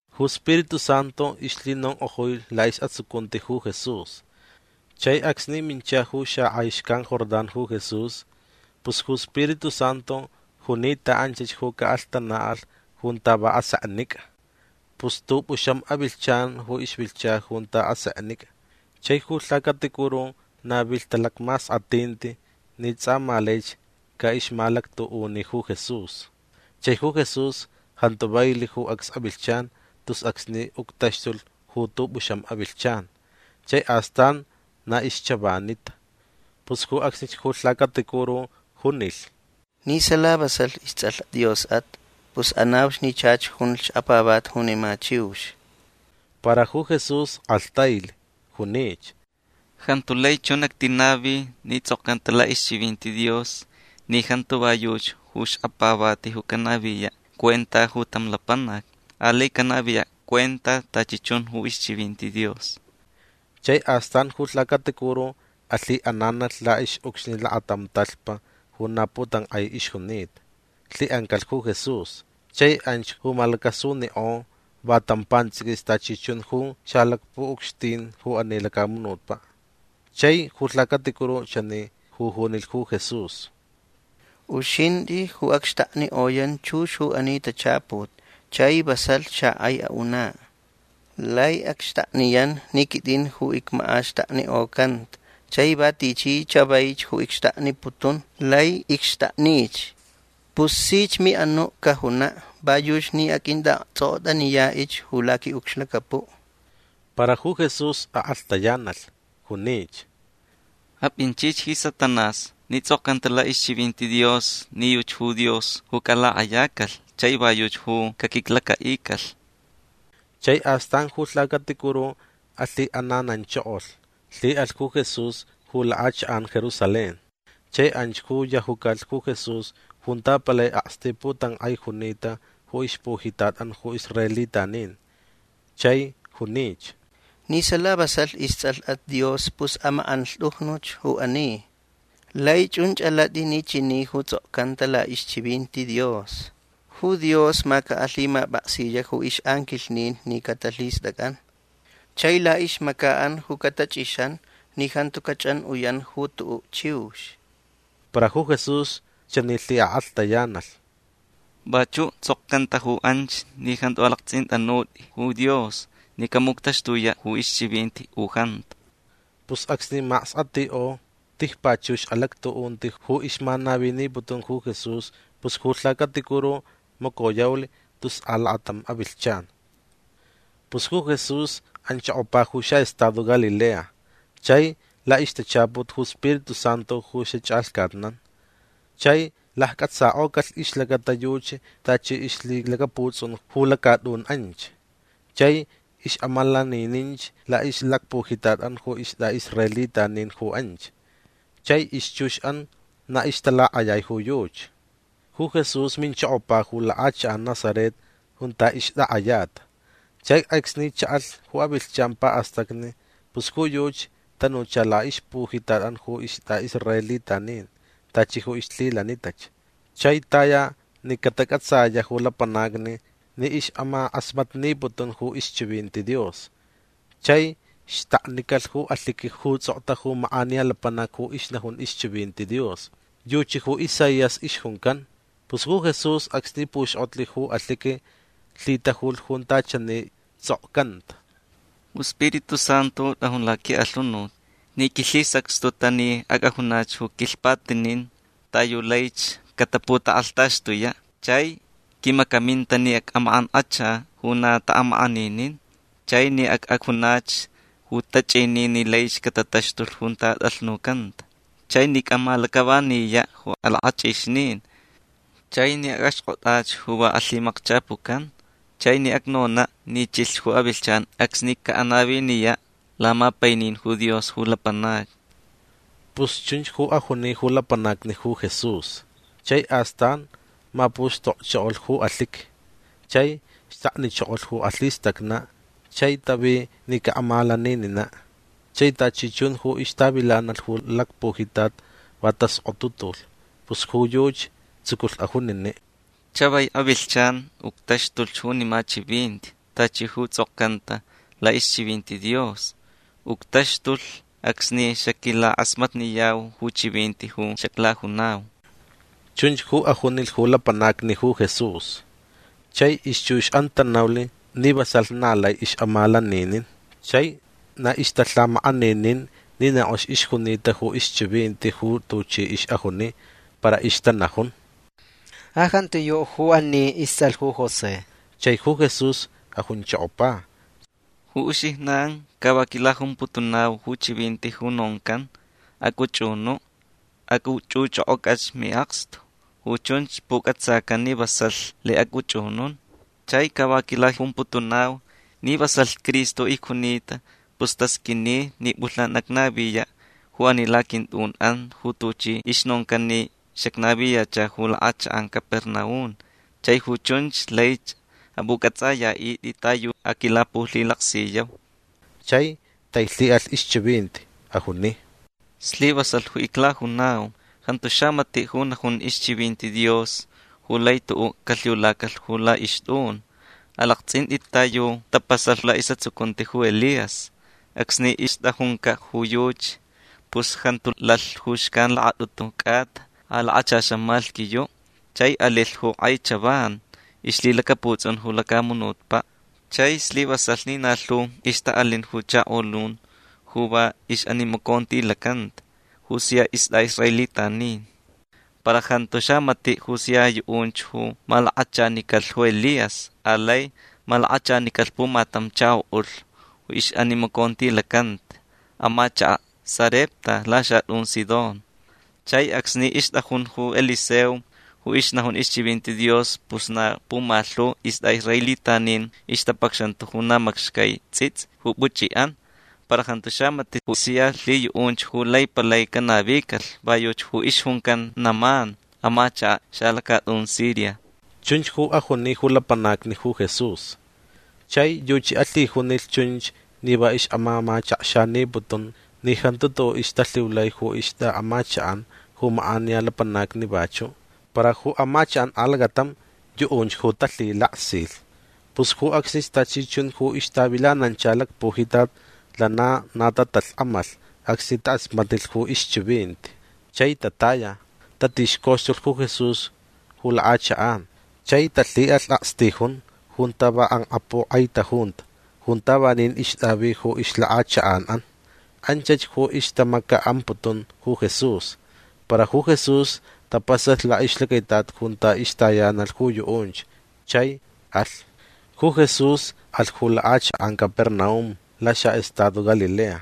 Ju Spiritu Santu ixlhinonk'ojui la'is'atsucunti ju Jesús. Chai acsni mincha ju xak'ai xcan Jordán ju Jesús pus ju Spiritu Santu juni ta anchach ju ca'alhtana'alh junta va aseknic'a. Pus t'up'uxam avilhchan ju ixvilhcha junta aseknic'a chai ju lhacaticuru navilh talacmask'at'inti ni ts'a ma laich ca'ixmalactu'uni ju Jesús. Chai ju Jesús jantu vailh ju acs avilhchan tus acsni uctaxtulh ju t'up'uxam avilhchan. Chai astan na ixchavanita. Pus ju acsnich ju lhacaticuru junilh: ―Ni sala vasalh ists'alh Dios'at pus anauch ni chach junch xkapavati junima chiux. Para ju Jesús k'alhtailh. Junich: ―Jantu lai chun actinavi ni ts'okcanta la'ixchivinti Dios ni jantu va yuchi ju xkapavati ju canaviya' cuenta ju tam lapanac. Alai canaviya' cuenta tachi chun ju ixchivinti Dios. Chai astan ju lhacaticuru alhi'ananalh la'ix'ucxni lakatam talhpa ju na putank'ai ixjunita. Lhi'ancalh ju Jesús. Chai anch ju malacasunik'o va tam pants'iquis tachi chun ju xalacpu'ucxtin ju ani lacamunutpa'. Chai ju lhacaticuru chani ju junilh ju Jesús: ―Uxint'ich ju acxtaknik'oyan chux ju ani tachaput chai vasalh xak'ai a'una'. Lai acxtakniyan ni quit'in ju icmak'axtaknik'ocanta chai va tichi chavaich ju icxtakniputun lai icxtaknich. Pus sich mi'anu' cajuna' va yuchi ni aq'uint'a'akts'ok'ot'aniya'ich ju laqui'ucxlacapu'. Para ju Jesús ak'alhtayanalh. Junich: ―Ap'inchich ji Satanás ni ts'okcanta la'ixchivinti Dios ni yuchi ju Dios ju calak'ayacalh chai va yuchi ju caquiclaca'icalh. Chai astan ju lhacaticuru alhi'anananchokolh. Lhi'alh ju Jesús ju lak'achak'an Jerusalén chai anch ju yajucalh ju Jesús junta palai aksti' putank'ai junita ju ixpujitat'an ju israelitanin. Chai junich: ―Ni sala vasalh ists'alh'at Dios pus amak'anlht'ujnuch ju ani. Lai chunch alat'i ni chani ju ts'okcanta la'ixchivinti Dios: Ju Dios ma camap'aksiya' ju ix'anquilhnin ni catalhist'ac'an. Chai la'ixmaca'an ju catach'ixanch ni jantu cach'an'uyan ju tu'u' chiux. Para ju Jesús chani lhik'alhtayanalh: ―Vachu' ts'okcanta ju anch ni jantu alakts'int'anut'i ju Dios ni camuctaxtuya' ju ixchivinti u jantu. Pus acsni mask'atik'o tijpachux alactu'unti ju ixmanaviniputun ju Jesús pus ju lhacaticuru macoyaulh tus alakatam avilhchan. Pus ju Jesús anchokopa ju xa'estado Galilea chai la'ixtachaput ju Spiritu Santu ju xach'alhcatnan. Chai lacc'atsak'ocalh ixlacata yuchi tachi ixlhilacaputs'un ju lacat'un anch. Chai ix'amalanininch la'ixlacpujitat'an ju ist'a'israelitanin ju anch. Chai ixchux'an na ixtalak'ayai ju yuchi. Ju Jesús minchokopa ju lak'achak'an Nazaret junta ixtak'ayata. Chai acsni cha'alh ju avilhchan pa'astacni pus ju yuchi tanucha la'ixpujitat'an ju ist'a'israelitanin tachi ju ixlhilanitach. Chai taya ni catac'atsaya' ju lapanacni ni ix'amak'asmatniputun ju ixchivinti Dios. Chai xtaknicalh ju alhiqui ju ists'okta ju mak'aniya lapanac ju ixnajun ixchivinti Dios. Yuchi ju Isaías ixjuncan. Pus ju Jesús acsni puxk'otlh ju alhiqui lhitajulh junta chani ists'okcanta: Ju Spiritu Santu t'ajun laqui'alhunut ni quilhisacxtuta ni ac'ajunach ju quilhpatinin ta yu laich cataputak'alhtaxtuya'. Chai quimacaminta ni ac'amak'ank'acha ju na ta'amak'aninin. Chai ni ac'ajunach ju tach'inin ni laich catataxtulh junta at'alhnucanta. Chai ni ac'amalac'avaniya' ju alak'ach'ixnin. Chai ni ac'axk'ot'ach ju va alhimakchapucan. Chai ni acnona' ni chilh ju avilhchan acsni ca'anaviniya' lamapainin ju Dios ju lapanacni. Pus chunch ju ajuni ju lapanacni ju Jesús. Chai astan mapuxtokchokolh ju alhiqui. Chai xtaknichokolh ju alhistacna' chai tavi ni ca'amalaninina'. Chai tachi chun ju ixtavilanalh ju lacpujitat va task'otutulh. Pus ju yuchi tsuculh ajunini': ―Chavai avilhchan uctaxtulh junima chivinti tachi ju ts'okcanta la'ixchivinti Dios. Uctaxtulh acsni xaquilak'asmatniyau ju chivinti ju xaclajunau. ―Chunch ju ajunilh ju lapanacni ju Jesús. Chai ixchux'an tanaulh ni vasalh na lai ix'amalaninin. Chai na ixtalhamak'aninin ni na k'ox ixjunita ju ixchivinti ju tuchi ix'ajuni. Para ixtanajun: ―Ja jantiyu' ju ani ists'alh ju José. Chai ju Jesús ajunchokopa: ―Ju uxijnan ca va quilajumputunau ju chivinti ju noncan: “Ac'uch'unu' ac'uch'uch'ok'oc'ach mi'akstu. Ju chunch puc'atsacan ni vasalh lai ac'uch'unun”. Chai ca va quilajumputunau ni vasalh Cristo icjunita pus tasq'uini ni p'ulhnan acnaviya' ju ani laquint'un'an ju tuchi ixnoncan ni xacnaviyacha ju lak'achak'an Capernaum chai ju chunch laich ap'uc'ats'aya'it'it ta yu aquilapulhilaksiyau. Chai tailhi'alh ixchivinti. Ajuni: ―Slivasalh ju iclajunau. Jantu xamati' ju najun ixchivinti Dios ju lai tu'u' calhiulacalh ju la'ixt'un. Alakts'int'it ta yu tapasalh la'is'atsucunti ju Elías. Acsni ixt'ajunca' ju yuchi pus jantu lalh ju xcan lakat'utu c'ata a lakachaxan malhquiyu'. Chai alilh ju k'ai chavan ixlhilacaputs'un ju lacamunutpa'. Chai slivasalh ni na lhu ixta'alin ju chakolun ju va ix'animacontilacanta ju sia ist'a'israelitanin. Para jantu xamati' ju sia yu'unch ju malakachanicalh ju Elías. Alai malakachanicalh pumatam chako'ulh ju ixnimacontilacanta amachaka' Sarepta laxat'un Sidón. Chai acsni ixt'ajun ju Eliseo ju ixnajun ixchivinti Dios pus na pumalhu ist'a'israelitanin ixtapacxanta ju na macxcai ts'its'i ju puch'i'an. Para jantu xamati' ju sia lhiyu'unch ju lai palai canavicalh. Va yuchi ju ixjuncan Naamán amachaka' xalacat'un Siria. Chunch ju ajuni ju lapanacni ju Jesús. Chai yuchi alhijunilh chunch ni va ix'amamachakxaniputun ni jantu tu'u' ixtalhiulai ju ixt'a'amachak'an ju mak'aniya lapanacni vachu'. Para ju amachak'an alacatam yu'unch ju talhilaksilh. Pus ju acsnich tachi chun ju ixtavilanancha lacpujitat lana na tatalhk'amalh acsni tak'asmatnilh ju ixchivinti. Chai tataya. Tatixcoxtulh ju Jesús ju lak'achak'an. Chai talhi'alh akstijun junta va k'ank'apuk'aitajunta junta vanin ixt'avi ju ixlak'achak'an'an. Anchach ju ixtamaca'amputun ju Jesús. Para ju Jesús tapasalh la'ixlacaitat junta ixtayanalh ju yu'unch. Chai alh. Ju Jesús alh ju lak'achak'an Capernaum laxa'estado Galilea.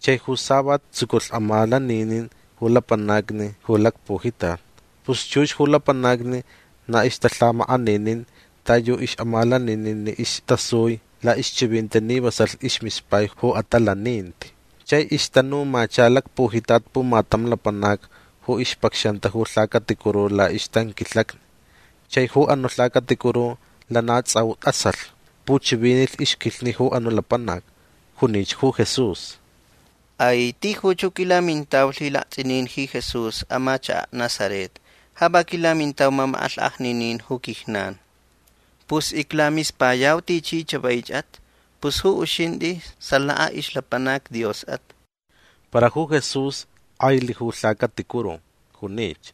Chai ju savat tsuculh amalaninin ju lapanacni ju lacpujitat. Pus chux ju lapanacni na ixtalhamak'aninin ta yu ix'amalaninin ni istasui la'ixchivinti ni vasalh ismispai ju atalaninti. Chai ixtanumacha lacpujitat pumatam lapanac ju ixpacxanta ju lhacaticuru la'ixtanquilhacni. Chai ju anu' lhacaticuru lana ts'au t'asalh. Puchivinilh ixquilhni ju anu' lapanac. Junich ju Jesús: ―Ai. Tijuch ju quilamintau lhilakts'inin ji Jesús amachaka' Nazaret. Ja va quilamintau mamak'alhk'ajninin ju quijnan. Pus iclamispayau tichi chavaich'at. Pus ju uxint'i salaka ixlapanac Dios'at. Para ju Jesús k'ailh ju lhacaticuru. Junich: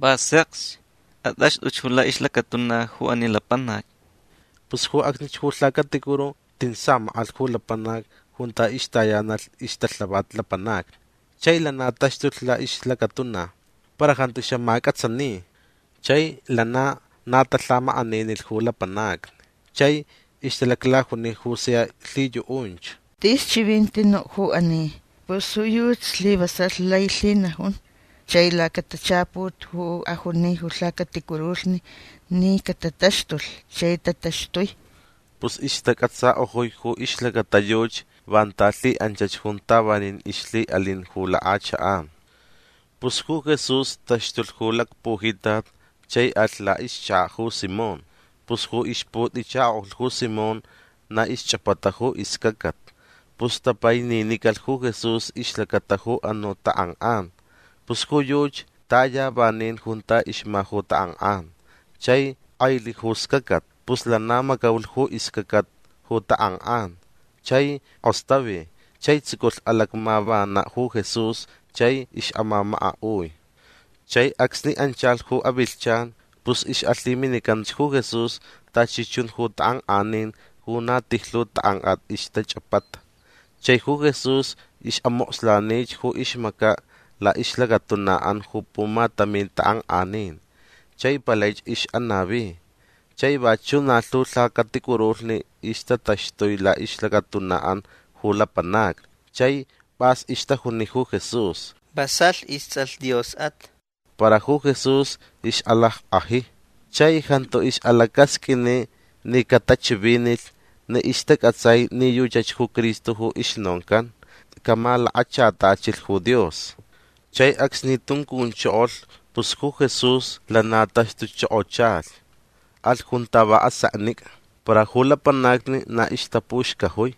―Va sekch. At'axt'uch ju la'ixlacatuna ju ani lapanac. Pus ju acsnich ju lhacaticuru tin samak'alh ju lapanac junta ixtayanalh ixtalhavat lapanacni. Chai lana taxtulh la'ixlacatuna. Para jantu xamac'atsani. Chai lana na talhamak'aninilh ju lapanacni. Chai ixtalaclajuni ju sia lhiyu'unch: ―Tis chivinti nu' ju ani. Pus ju yuchi slivasalh lai lhinajun chai lacatachaput ju ajuni ju lhacaticurulhni ni catataxtulh chai tataxtui. Pus ixtac'atsak'ojui ju ixlacata yuchi vanta lhi'anchach junta vanin ixlhi'alin ju lak'achak'an. Pus ju Jesús taxtulh ju lacpujitat chai alh la'ixchaka' ju Simón. Pus ju ixput'ichako'ulh ju Simón na ixch'apata ju iscacat. Pus tapaininicalh ju Jesús ixlacata ju anu' tak'ank'an. Pus ju yuchi taya vanin junta ixma ju tak'ank'an. Chai k'ailh ju scacat. Pus lana macaulh ju iscacat ju tak'ank'an. Chai k'ostavi chai tsuculh alacmavana' ju Jesús chai ix'amamaka'ui. Chai acsni anchalh ju avilhchan pus ix'alhiminicanch ju Jesús tachi chun ju tak'ank'anin ju na tijlhu tak'ank'at ixtach'apata. Chai ju Jesús ix'amokslanich ju ixmaca' la'ixlacatuna'an ju pumatamin tak'ank'anin chai palaich ix'anavi. Chai vachu' na lhu lhacaticurulhni ixtataxtui la'ixlacatuna'an ju lapanacni. Chai p'as ixtajuni ju Jesús: ―Vasalh ists'alh Dios'at. Para ju Jesús ix'alack'aji. Chai jantu ix'alacasq'uini ni catachivinilh ni ixtac'atsai ni yuchach ju Cristo ju ixnoncan camalakachatachilh ju Dios. Chai acsni tuncunchokolh pus ju Jesús lana taxtuchokochalhch. Alh junta va aseknic'a. Para ju lapanacni na ixtapuxcajui.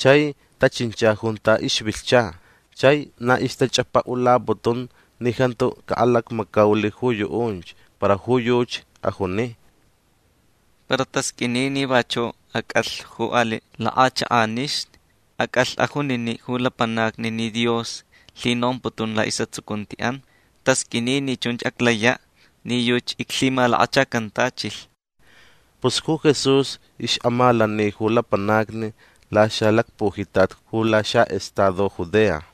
Chai tachincha junta ixvilhcha. Chai na ixtach'apa'ulaputun ni jantu ca'alacmacaulh ju yu'unch. Para ju yuchi ajuni: ―Para tasq'uini ni vachu' ac'alh ju ali' lak'achak'anixni. Ac'alh ajunini' ju lapanacni ni Dios lhinomputun la'is'atsucunti'an. Tasq'uini ni chunch aclaya' ni yuchi iclhimalakachacantachilh. Pus ju Jesús ix'amalani ju lapanacni laxalacpujitat ju laxa'estado Judea.